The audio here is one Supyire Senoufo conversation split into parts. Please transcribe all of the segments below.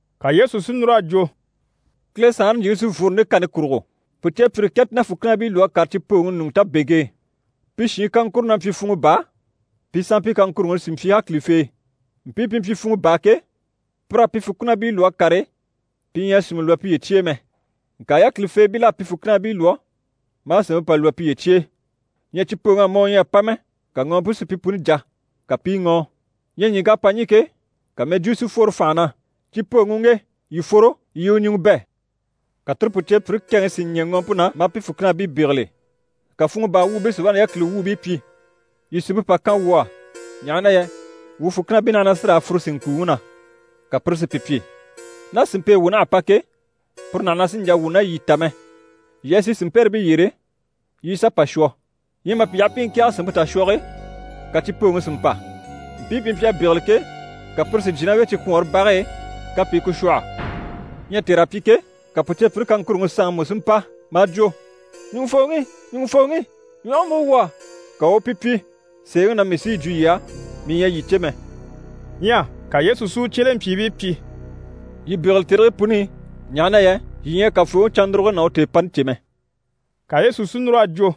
Ka Yesu si núr'a jwo: «Kile Saanre ɲjyìŋi sí n‑fworo nde kani kurugo: pùceepyire kɛ ti ná fùkinabii lwɔ́ a kàre cipooŋi ɲùŋɔ tabeŋke e. Pi shiin kaŋkuro na mpyi funŋɔ baa, pi sanmpii kaŋkuruŋi sí mpyi yákilifee. Mpii pi mpyi funŋɔ baa ke, pir'à pi fùkinabii lwɔ́ a kàre, pi ɲyɛ a sìnmɛ lwɔ́ piye cye e mɛ. Ŋka yákilifeebil'à pi fùkinabii lwɔ́ maa sìnmpe pà lwɔ́ piye cye e. Ɲyɛ cipooŋ'à mɔ u ɲyɛ a pa mɛ, ka ŋɔɔmpe si pi puni jà, ka pi i ŋɔ́ɔ. Ɲyɛ ɲìŋk'à pa ɲî ke, ka mɛjwuu si fworo fànha na “Cipooŋi u ŋge! Yii fworo, yii i u ɲùŋɔ bɛ̂!” Ka tire pùceepyire kɛŋi si ɲɛ̀ ŋɔɔmpe na, maa pi fùkinabii bégele. Ka funŋɔ baa wuubii si wá na yákili wuubii pyi “Yii sìnmpe pà kan wuu á, ɲaha na yɛ wuu fùkinabii naha na sí raa fùre sìnŋkuuŋi na!” Ka pire si pi pyi “Ná sìnmpe e wuu naha a pa ke, puru naha na sì n‑jà wuu ná yii ta mɛ. Yii a sì sìnmpɛrɛbii yyére, yii i sà pà shwɔ.” Ɲyɛ mà pi yaha pi i ŋkɛ̀ɛge sìnmpe tashwɔge e, ka cipooŋi si mpa. Mpii pi mpyi a bégele ke, ka pire si jyè ná u e cikwɔɔnre bage e, ka pi i ku shwɔ̂hɔ. Ɲyɛ tèr'à pyi ke, ka pùceepyire kaŋkuruŋi sanŋi mú si mpa maa jwo “Ɲùŋufooŋi, ɲùŋufooŋi! Ɲwɔge múgo wuu á.” Ka u u pi pyi “Sèeŋi na mii sí yi jwo yii á, mii ɲyɛ a yii cè mɛ.”» Ɲyɛ ka Yesu si u cyelempyiibii pyi: «Yii bégele tèrigii puni i, ɲaha na yɛ yii ɲyɛ a Kafooŋi cannuruge ná u tèepani cè mɛ.» Ka Yesu si núr'a jwo: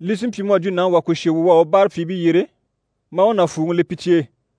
«Li sí n‑pyi mu à jwo nàŋi wà kùshe wu u à u báarapyiibii yyere, maa u nàfuuŋi le pi cye e.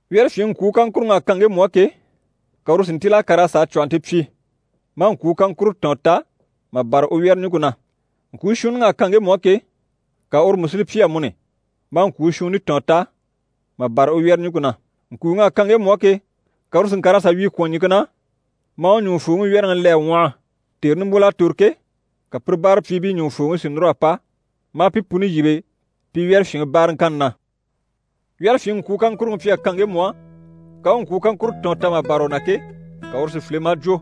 Wyɛ́rɛfyinŋi ŋkwuu kaŋkuruŋ'à kan ŋgemu á ke, ka uru si ntíl'a kàr'a sà a cwɔ̀hɔnte pyi, maa ŋkwuu kaŋkuro tɔ̀ɔn ta mà bâra u wyɛ́rɛɲuŋke na. Ŋkwuu shuunniŋ'à kan ŋgemu á ke, ka uru mú si li pyi amuni, maa ŋkwuu shuunni tɔ̀ɔn ta mà bâra u wyɛ́rɛɲuŋke na. Ŋkuuŋ'à kan ŋgemu á ke, ka uru si ŋkàr'a sà wyii kwɔ̀n ɲìŋke na, maa u ɲùŋufooŋi wyɛ́rɛŋi le a ŋwɔhɔ. Tère nimbwol'à tòro ke, ka pire báarapyiibii ɲùŋufooŋi si núr'a pa, maa pi puni yíbe pi wyɛ́rɛfyinŋi báaraŋkanni na. Wyɛ́rɛfyinŋi ŋkwuu kaŋkuruŋi mpyi a kan ŋgemu á, ka u u ŋkwuu kaŋkuro tɔ̀ɔn ta mà bâra u na ke, ka uru si file maa jwo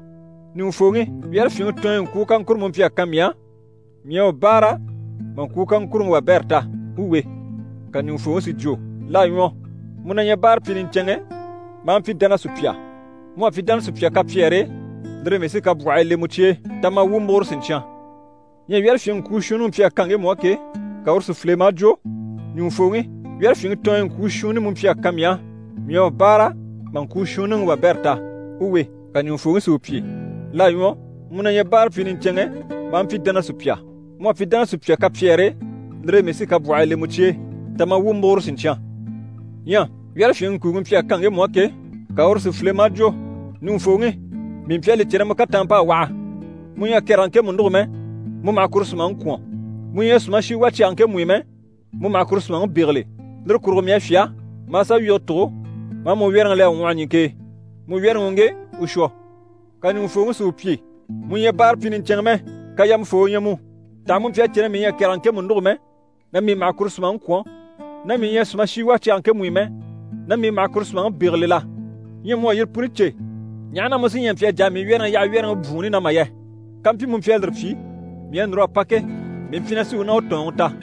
“Ɲùŋufooŋi, wyɛ́rɛfyinŋi tɔɔnyɔ ŋkwuu kaŋkuro mu mpyi a kan mii á, mii à u báara mà ŋkwuu kaŋkuruŋi wabɛrɛ ta. U we.” Ka ɲùŋufooŋi si jwo “L'à ɲwɔ, mu na ɲyɛ báarapyi niɲcɛnŋɛ maa mpyi dánasupya. Mu à pyi dánasupya kapyɛɛre e, lire e mii sí kabwɔhii le mu cye e. Ta ma, wuu u múguro siɲcyan.” Ɲyɛ wyɛ́rɛfyinŋi ŋkwuu shuunniŋi mpyi a kan ŋgemu á ke, ka uru si file maa jwo “Ɲùŋufooŋi, wyɛ́rɛfyinŋi tɔɔnyɔ ŋkwuu shuunni mu mpyi a kan mii á, mii à u báara mà ŋkwuu shuunniŋi wabɛrɛ ta. U we.” Ka ɲùŋufooŋi si u pyi “L'à ɲwɔ, mu na ɲyɛ báarapyi niɲcɛnŋɛ maa mpyi dánasupya. Mu à pyi dánasupya kapyɛɛre e, lire e mii sí kabwɔhii le mu cye e. Ta ma, wuu u múguro siɲcyan.” Ɲyɛ wyɛ́rɛfyinŋi ŋkuuŋi mpyi a kan ŋgemu á ke, ka uru si file maa jwo “Ɲùŋufooŋi, mii mpyi a li cè na mu kataanmp'à waha, mu ɲyɛ a kɛrɛge ŋkemu nûgo mɛ, mu maha kuru sùmaŋi kwɔ̀n, mu ɲyɛ a sùmashi wà cyage ŋkemu i mɛ, mu maha kuru sùmaŋi bégele. Lire kurugo mii à fyá, maa sà wyige tùgo, maa mu wyɛ́rɛŋi le a ŋwɔhɔ ɲìŋke e. Mu wyɛ́rɛŋi u ŋge, u shwɔ.” Ka ɲùŋufooŋi si u pyi “Mu ɲyɛ báarapyi niɲcɛnŋɛ mɛ, kayamafoo u ɲyɛ mu. Taha mu mpyi a cè na mii ɲyɛ a kɛrɛge ŋkemu nûgo mɛ, na mii maha kuru sùmaŋi kwɔ̀n, na mii ɲyɛ a sùmashi wà cyage ŋkemu i mɛ, na mii maha kuru sùmaŋi bégele la? Ɲyɛ mu à yire puni cè, ɲaha na mu sí ɲyɛ a mpyi a jà a mii wyɛ́rɛŋi yaha wyɛ́rɛŋi bwùunni na mà yɛ? Kampyi mu mpyi a lire pyi, mii à núr'a pa ke, mii mpyi na sí u ná u tɔ̀ɔnŋi ta.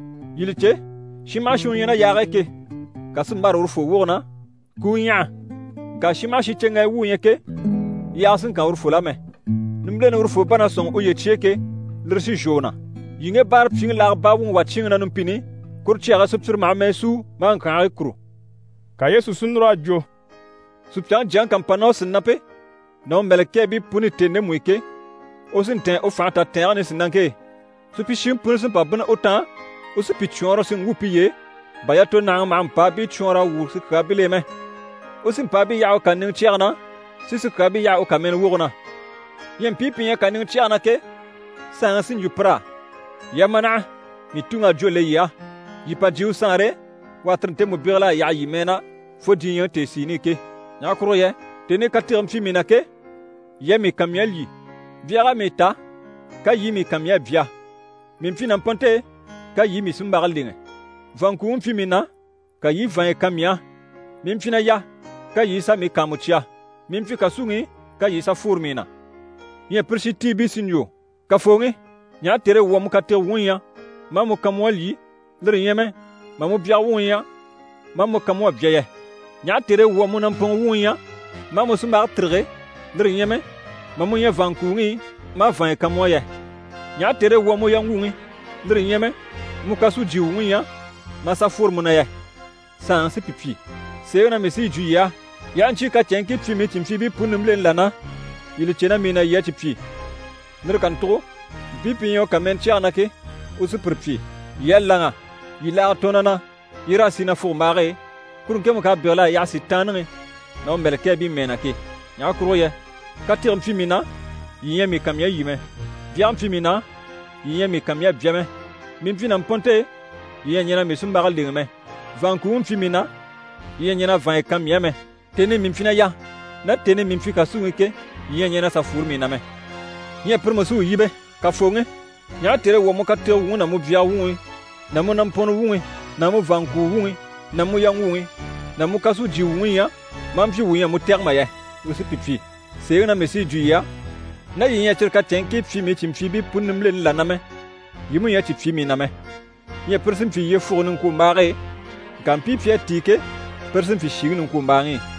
Yii li cè, shin maha shin u ɲyɛ ná yaage e ke, kà sí n‑bâra urufoo woge na, ku u ɲyaha. Ŋka shin maha shin cyeŋgayi wu u ɲyɛ ke, yaaga sì n‑kan urufol'á mɛ. Nimbileni urufoo bá na sɔ̂nŋi uye cye e ke, lire sí n‑shwɔ u na. Yii ŋge báarapyiŋi laaga baa wuŋi wà cyíinŋi na numpini i, kuru cyage e sùpyire maha mɛɛ súu maa ŋkyànhigii kùru.”» Ka Yesu si núr'a jwo: «Supyaŋi Jyaŋi ká mpa ná u sìnampe ná u mɛ̀lɛkɛɛbii puni i tèni ndemu i ke, u sí n‑tɛ̀ɛn u fànhe tatɛɛnge nisinaŋke e. Supyishiŋi puni sí n‑pa bínni u taan, u sí pi cwɔɔnrɔ si ŋgwû piye e, bà yatonahaŋi maha mpàabii cwɔɔnr'a wwû sikyaabil'e mɛ. U sí mpàabii yaha u kàniŋɛ cyɛge na, si sikyaabii yaha u kàmɛnɛ woge na. Ɲyɛ mpii pi ɲyɛ kàniŋɛ cyɛge na ke, saanŋi sí n‑jwo pir'á “Yii a ma naha, mii Tuŋi à jwó le yii á. Yii pa jyè u Saanre e, u à tire ntemu bégel'a yaha yii mɛɛ na fo diɲyɛŋi tèesiini i ke. Ɲaha kurugo yɛ tèni i katege mpyi mii na ke, yii à mii kan mii à lyî, byag'à mii ta ka yii i mii kan mii à bya. Mii mpyi nàmpɔnnte e, ka yii i mii sunmbage lèŋɛ. Vàanŋkuuŋi mpyi mii na, ka yii i vàanya kan mii á. Mii mpyi na yà, ka yii i sà mii kàanmucya. Mii mpyi kàsuŋi i, ka yii i sà fworo mii na.” Ɲyɛ pire shintiibii sí n‑jwo “Kafooŋi, ɲaha tère e wuu à mu katege wuŋi ɲya, maa mu kan mu à lyî, lire ɲyɛ mɛ mà mu byaga wuŋi ɲya, maa mu kan mu à bya yɛ? Ɲaha tère e wuu à mu nàmpɔnŋɔ wuŋi ɲya, maa mu sunmbage tîrige, lire ɲyɛ mɛ mà mu ɲya vàanŋkuuŋi i, maa vàanya kan mu á yɛ? Ɲaha tère e wuu à mu yaŋgwuŋi, lire ɲyɛ mɛ mu kàsujye wuŋi ɲya, maa sà fworo mu na yɛ?” Saanŋi sí pi pyi “Sèeŋi na mii sí yi jwo yii á, yii aha ɲcyii kacɛnŋkii pyi mii cìnmpyiibii puni nimbileni là na, yii li cè na mii na yii à cyi pyi.” Lire kàntugo mpii pi ɲyɛ u kàmɛnɛ cyɛge na ke, u sí pire pyi “Yii à láŋa, yii laaga tɔɔn na na, yii raa sì nafugombaage e, kuru ŋkemu k'à bégel'a yaha Sitaanniŋi ná u mɛ̀lɛkɛɛbii mɛɛ na ke. Ɲaha kurugo yɛ katege mpyi mii na, yii ɲyɛ a mii kan mii a lyî mɛ, byage mpyi mii na, yii ɲyɛ a mii kan mii a bya mɛ. Mii mpyi nàmpɔnnte e, yii ɲyɛ a ɲɛn'a mii sunmbage lèŋɛ mɛ, vàanŋkuuŋi mpyi mii na, yii ɲyɛ a ɲɛn'a vàanya kan mii á mɛ. Tèni i mii mpyi na yà, ná tèni i mii mpyi kàsuŋi i ke, yii ɲyɛ a ɲɛn'a sà fworo mii na mɛ.” Ɲyɛ pire mú sí u yíbe “Kafooŋi, ɲaha tère e wuu à mu katege wuŋi ná mu byaga wuŋi ná mu nàmpɔnŋɔ wuŋi ná mu vàanŋkuu wuŋi ná mu yaŋgwuŋi ná kàsujye wuŋi ɲya, maa mpyi wuu ɲyɛ a mu tɛ̀gɛ mà yɛ?” U sí pi pyi “Sèeŋi na mii sí yi jwo yii á, ná yii ɲyɛ a cyire kacɛnŋkii pyi mii cìnmpyiibii puni nimbileni là na mɛ, yii mú ɲyɛ a cyi pyi mii na mɛ.” Ɲyɛ pire sí n‑pyi yyefuge niŋkwombaage e, ŋka mpii pi à tíi ke, pire sí n‑pyi shìŋi niŋkwombaaŋi i.»